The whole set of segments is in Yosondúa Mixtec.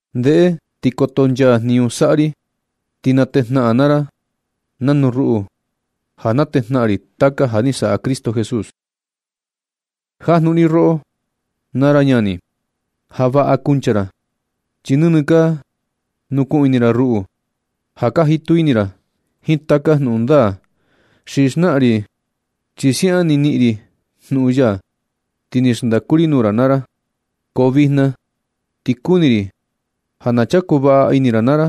Ndeꞌe ti kotonchaa jniñu saꞌa ri, ti na tejnaꞌan naa ra nanu ruꞌu ja na tejnaꞌan ri taka ja ni saꞌa Cristo Jesús. Jajnuꞌun ri roꞌo naa ra ñani, ja vaꞌa kanchuku ra, chi nɨnɨ ka nukuꞌun ini ra ruꞌu, ja ka jitu ini ra jiin taka jnuꞌun ndaa ni xnaꞌan ri. Chi siaꞌan ni niꞌin ri jnuꞌun ya, ti ni xndaku ri nuu ra naa ra. Ko vijna ti kuni ri ja na chaku vaꞌa ini ra naa ra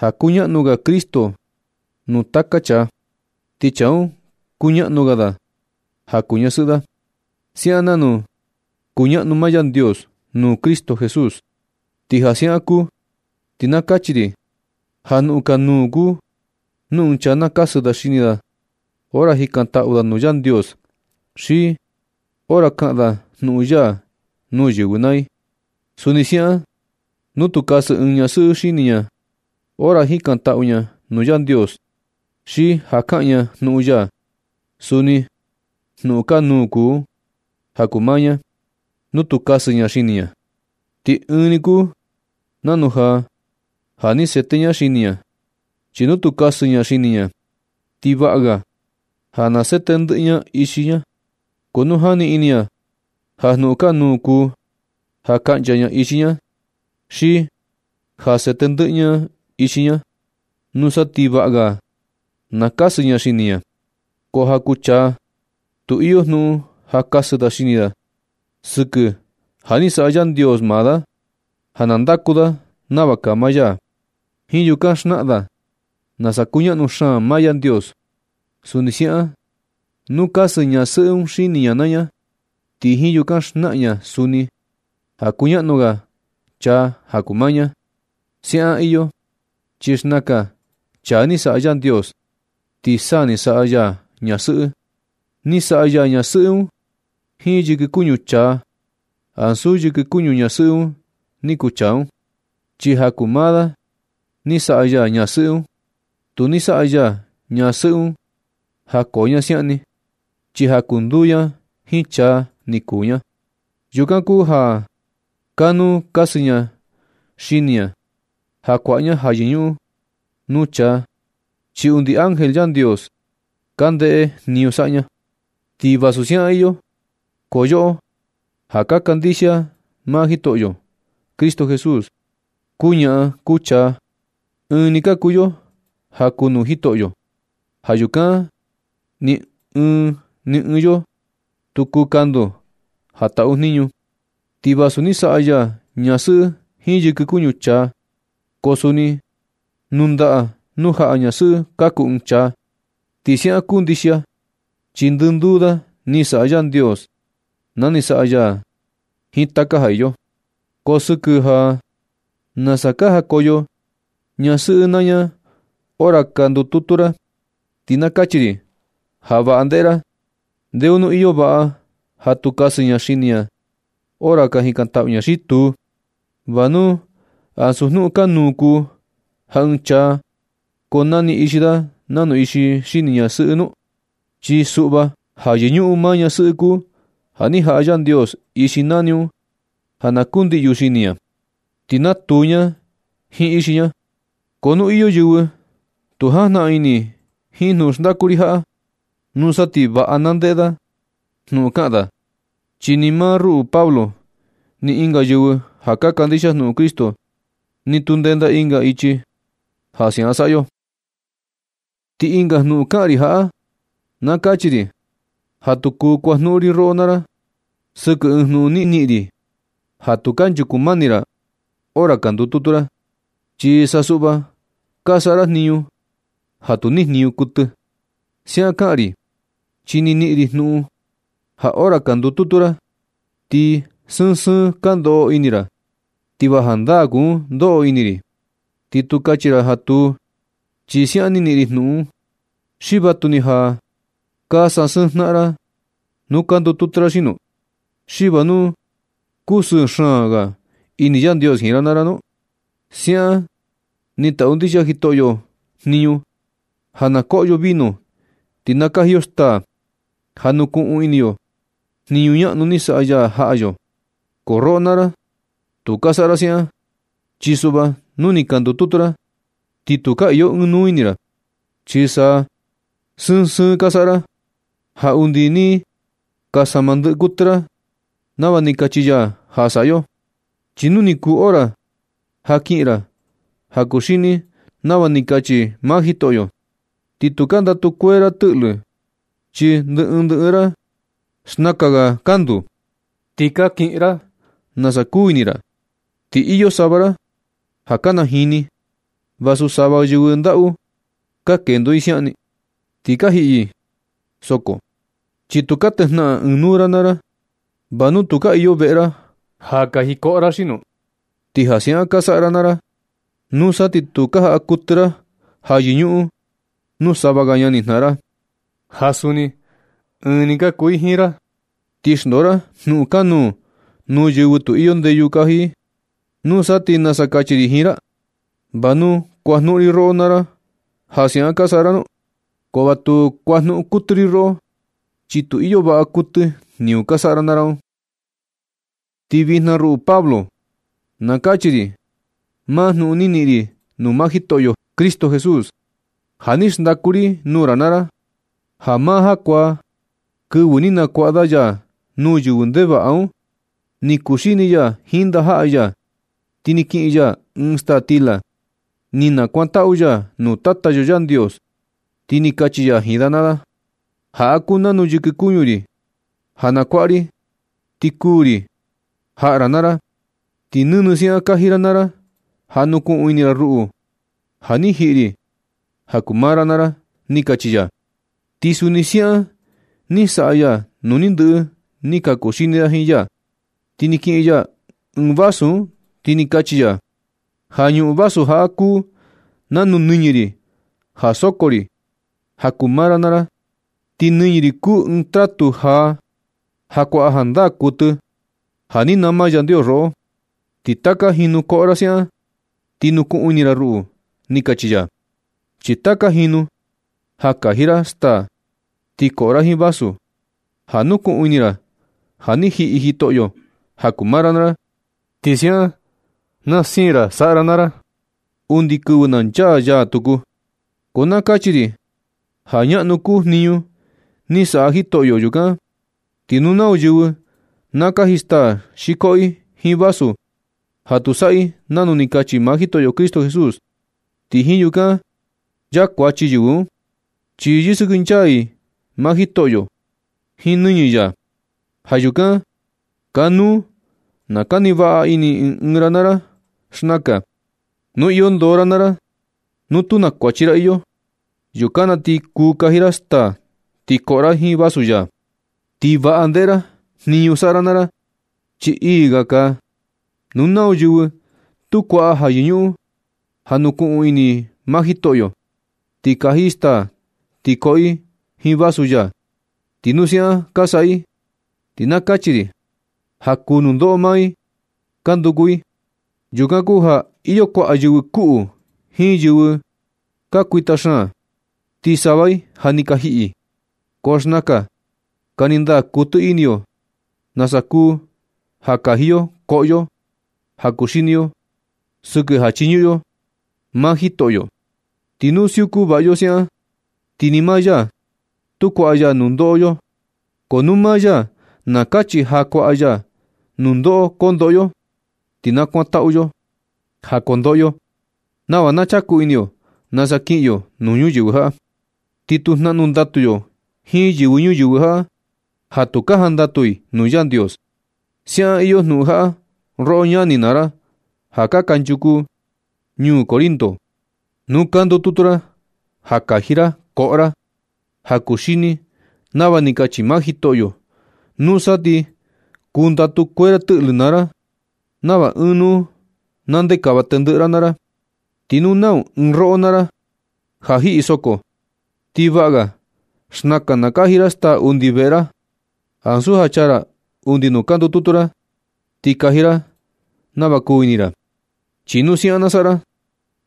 ja kuñaꞌnu ga Cristo nuu taka chaa, ti chaa un kuñaꞌnu ga da ja kuu ñasɨꞌɨ da, siaꞌan nanu kuñaꞌnu maa Yandios nuu Cristo Jesús. Ti ja siaꞌan kuu, ti na kachi ri ja jnuꞌun kanuu kuu nu ɨɨn chaa na kasɨ da xini da hora jikantaꞌu da nuu Yandios, xi hora kaꞌan da jnuꞌun ya nuu yɨvɨ naa i. Suni siaꞌan nu tu kasɨ ɨɨn ñasɨꞌɨ xini ña hora jikantaꞌu ña nuu Yandios, xi ja kaꞌan ña jnuꞌun ya, suni jnuꞌun kanuu kuu un ja kuu maa ña nu tu kasɨ ña xini ña, ti ɨɨn ni kuu nanu ja ja ni sete ña xini ña. Chi nu tu kasɨ ña xini ña, ti vaꞌa ga na sete ndɨꞌɨ ña ixi ña. Ko nu jani ini ña ja jnuꞌun kanuu kuu ja kaꞌncha ña ixi ña, xi ja sete ndɨꞌɨ ña ixi ña, nusa ti vaꞌa ga na kasɨ ña xini ña. Ko ja kuu chaa tu iyo jnuꞌun ja kasɨ da xini da, sɨkɨ ja ni saꞌa Yandios maa da ja na ndaku da nava kaa maa ya. Jiin yukan xnaꞌan da nasa kuñaꞌnu xaan maa Yandios. Suni siaꞌan, nu kasɨ ñasɨꞌɨ un xini ña naa ña, ti jiin yukan xnaꞌan ña suni ja kuñaꞌnu ga chaa ja kuu maa ña. Siaꞌan iyo chi xnakan chaa ni saꞌa Yandios, ti sa ni saꞌa ya ñasɨꞌɨ. Ni saꞌa ya ñasɨꞌɨ un jiin yɨkɨ kuñu chaa, ansu yɨkɨ kuñu ñasɨꞌɨ un ni kuu chaa un, chi ja kuu maa da ni saꞌa ya ñasɨꞌɨ un. Tu ni saꞌa ya ñasɨꞌɨ un ja koo ña siaꞌan ni, chi ja na kunduu ña jiin chaa ni kuu ña. Yukan kuu ja kanuu kasɨ ña xini ña ja kuaꞌa ña ja yɨñuꞌun nuu chaa, chi undi ángel Yandios ka ndeꞌe jniñu saꞌa ña. Ti vasu siaꞌan iyo, ko yoꞌo ja ka kandixia maa Jitoꞌyo Cristo Jesús, kuu ñaꞌan kuu chaa, ɨɨn ni ka kuu yo ja kuu nuu Jitoꞌyo. Ja yukan ni ɨɨn ni ɨɨn yo tu kuu kandu ja taꞌu jniñu. Ti vasu ni saꞌa ya ñasɨꞌɨ jiin yɨkɨ kuñu chaa, ko suni nuu ndaꞌa nuu jaꞌa ñasɨꞌɨ kaku ɨɨn chaa. Ti siaꞌan kuu ndixia, chi ndɨnduu da ni saꞌa Yandios na ni saꞌa ya da jiin taka ja iyo. Ko sɨkɨ ja nasa ka jakoyo ñasɨꞌɨ naa ña hora ka ndututu ra, ti na kachi ri ja vaꞌa ndeꞌe ra, ¿ndeo nu iyo vaꞌa ja tu kasɨ ña xini ña naa ña hora ka jikantaꞌu ña xi tuu? ¿Va nu ansu jnuꞌun kanuu kuu ja ɨɨn chaa koo nani ixi da nanu ixi xini ñasɨꞌɨ nu? Chi suꞌva ja yɨñuꞌun maa ñasɨꞌɨ kuu ja ni jaꞌa Yandios ixi nani un ja na kundiꞌyu xini ña, ti na tuu ña jiin ixi ña. Ko nu iyo yɨvɨ tu jajnaꞌan ini jiin jnuꞌun xndaku ri jaꞌa, nusa ti vaꞌa na ndeꞌe da jnuꞌun kaꞌan da, chi ni maa ruꞌu Pablo ni ɨnga yɨvɨ ja ka kandixia jnuꞌun Cristo, ni tu ndenda ɨnga ichi ja siaꞌan saꞌa yo. Ti ɨnga jnuꞌun ja kaꞌan ri jaꞌa. Na kachi ri ja tu kuu kuajnuꞌun ri roꞌo naa ra sɨkɨ ɨɨn jnuꞌun ni niꞌin ri ja tu kanchuku mani ra hora ka ndututu ra, chi sa suꞌva ka saꞌa ra jniñu ja tu ni jniñu kuɨtɨ. Siaꞌan kaꞌan ri, chi ni niꞌin ri jnuꞌun ja hora ka ndututu ra, ti sɨɨn sɨɨn ka ndoꞌo ini ra, ti va jandaa kuu un ndoꞌo ini ri. Ti tu kachi ra ja tu, chi siaꞌan ni niꞌin ri jnuꞌun. ¿Xi vatuni ja ka sasɨɨn jnaꞌan ra nu ka ndututu ra xino? ¿Xi va nu kusɨɨ xaan ga ini Yandios jiin ra naa ra nu? Siaꞌan ni taꞌu ndixia Jitoꞌyo jniñu ja na koꞌo yo vino ti na kaji yo staa ja nukuꞌun ini yo jniñu ñaꞌnu ni saꞌa ya jaꞌa yo. Ko roꞌo naa ra, tu ka saꞌa ra siaꞌan, chi suꞌva nu ni ka ndututu ra, ti tu ka iyo ɨɨn nuu ini ra. Chi sa sɨɨn sɨɨn ka saꞌa ra, ja undi ni ka sama ndɨꞌɨ kuɨtɨ ra nava ni kachi ya ja saꞌa yo. Chi nu ni kuu hora ja kiꞌin ra ja kuxini nava ni kachi maa Jitoꞌyo, ti tu ka ndatu kuee ra tɨꞌlɨ, chi ndɨ ɨɨn ndɨ ɨɨn ra, xnakan ga kandu, ti ka kiꞌin ra nasa kuu ini ra. Ti iyo sava ra ja ka najini vasu sava yɨvɨ ndaꞌu ka kendo i siaꞌan ni, ti ka jiꞌi yɨ soko, chi tu ka tejnaꞌan ɨɨn nuu ra naa ra. ¿Va nu tu ka iyo veꞌe ra ja kaji koꞌo ra xino? Ti ja siaꞌan ka saꞌa ra naa ra, nusa ti tu ka jaꞌa kuɨtɨ ra ja yɨñuꞌun nuu sava ga ñanijnaꞌan ra, ja suni ɨɨn ni ka kuu i jiin ra, ti xndoo ra jnuꞌun kanuu nuu yɨvɨ tu iyo ndeyu kaji i. ¿Nusa ti nasa kachi ri jiin ra? ¿Va nu kuajnuꞌun ri roꞌo naa ra ja siaꞌan ka saꞌa ra nu? Ko va tu kuajnuꞌun kuɨtɨ ri roꞌo, chi tu iyo vaꞌa kuɨtɨ jniñu ka saꞌa ra naa ra un. Ti vijna, ruꞌu Pablo, na kachi ri maa jnuꞌun ni niꞌin ri nuu maa Jitoꞌyo Cristo Jesús. Ja ni xndaku ri nuu ra naa ra ja maa jakuaa, kɨvɨ ni nakuaꞌa da ya nuu yɨvɨ ndevaꞌa un, ni kuxini ya jiin ndajaꞌa ya. Ti ni kiꞌin ya ɨɨn staa stila, ni nakuantaꞌu ya nuu Tata yo Yandios, ti ni kachi ya jiin da naa da: “Jaꞌa kuu nanu yɨkɨ kuñu ri ja na kuaꞌa ri ti kuu ri jaꞌa ra naa ra. Ti nɨnɨ siaꞌan kaji ra naa ra ja nukuꞌun ini ra, ruꞌu ja ni jiꞌi ri ja kuu maa ra naa ra”, ni kachi ya. Ti suni siaꞌan ni saꞌa ya nu ni ndɨꞌɨ ni ka kuxini da jiin ya. Ni kiꞌin ya ɨɨn vasu un, ti ni kachi ya: “Ja ñuꞌun vasu jaꞌa kuu nanu nɨñɨ ri ja soko ri ja kuu maa ra naa ra. Ti nɨñɨ ri kuu ɨɨn tratu jaa ja kuaꞌa jandaa kuɨtɨ ja ni nama Yandios roꞌo. Ti taka jinu koꞌo ra siaꞌan, ti nukuꞌun ini ra ruꞌu”, ni kachi ya. Chi taka jinu ja kaji ra staa ti koꞌo ra jiin vasu, ja nukuꞌun ini ra ja ni jiꞌi Jitoꞌyo ja kuu maa ra naa ra, ti siaꞌan na siin ra saꞌa ra naa ra undi kɨvɨ na nchaa ya tuku. Ko na kachi ri ja ñaꞌnu kuu jniñu ni saꞌa Jitoꞌyo. Yukan ti nu nau yɨvɨ na kaji staa xi koꞌo i jiin vasu ja tu saꞌa i nanu ni kachi maa Jitoꞌyo Cristo Jesús, ti jiin yukan nchaa kuachi yɨvɨ un, chi yɨsɨkɨnchaa i maa Jitoꞌyo jiin nɨñɨ ya. Ja yukan kanuu na kani vaꞌa ini ɨɨn ɨɨn ra naa ra xnakan, nu iyo ndoo ra naa ra, nu tu na kuachi ra iyo, yukan na ti kuu kaji ra staa ti koꞌo ra jiin vasu ya. Ti vaꞌa ndeꞌe ra jniñu saꞌa ra naa ra, chi ii ga kaa. Nu nau yɨvɨ tu kuaꞌa ja yɨñuꞌun ja nukuꞌun ini i maa Jitoꞌyo, ti kaji i staa ti koꞌo i jiin vasu ya, ti nu siaꞌan ka saꞌa i, ti na kachi ri ja kuu nundoꞌo maa i ka nduku i. Yukan kuu ja ka iyo kuaꞌa yɨvɨ kuꞌu jiin yɨvɨ ka kuita xaan. Ti sava i ja ni ka jiꞌi. Ko xnakan kani ndaa kuɨtɨ ini yo nasa kuu ja kaji yo koꞌo yo, ja kuxini yo sɨkɨ ja chiñuꞌun yo maa Jitoꞌyo. Ti nu siuku vaꞌa yo siaꞌan, ti ni maa ya tu kuaꞌa ya kundoꞌo yo. Ko nu maa ya na kachi ja kuaꞌa ya nundoꞌo kondoꞌo yo, ti na kuantaꞌu yo ja kundoꞌo yo nava na chaku ini yo nasa kiꞌin yo nuu ñuyɨvɨ jaꞌa, ti tu jnaꞌnu ndatu yo jiin yɨvɨ ñuyɨvɨ jaꞌa ja tu ka jandatu i nuu Yandios. Siaꞌan iyo jnuꞌun jaꞌa roꞌo ñani naa ra ja kanchuku ñuu Corinto. Nu ka ndututu ra ja kaji ra koꞌo ra ja kuxini nava ni kachi maa Jitoꞌyo, nusa ti kundatu kuee ra tɨꞌlɨ naa ra nava ɨɨn nuu na ndekava tendɨꞌɨ ra naa ra. Ti nu nau ɨɨn roꞌo naa ra ja jiꞌi soko, ti vaꞌa ga xnakan na kaji ra staa undi veꞌe ra, ansu ja chaa ra undi nuu ka ndututu ra ti kaji ra nava kuu ini ra. Chi nu siaꞌan na saꞌa ra,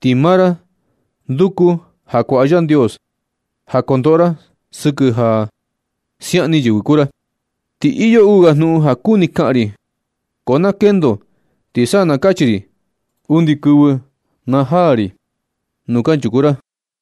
ti maa ra nduku ja kuaꞌa Yandios ja kundoꞌo ra sɨkɨ ja siaꞌan ni yɨvɨ kuu ra. Ti iyo uu ga jnuꞌun ja kuni kaꞌan ri, ko na kendo ti sa na kachi ri undi kɨvɨ na jaa ri nuu kanchuku ra.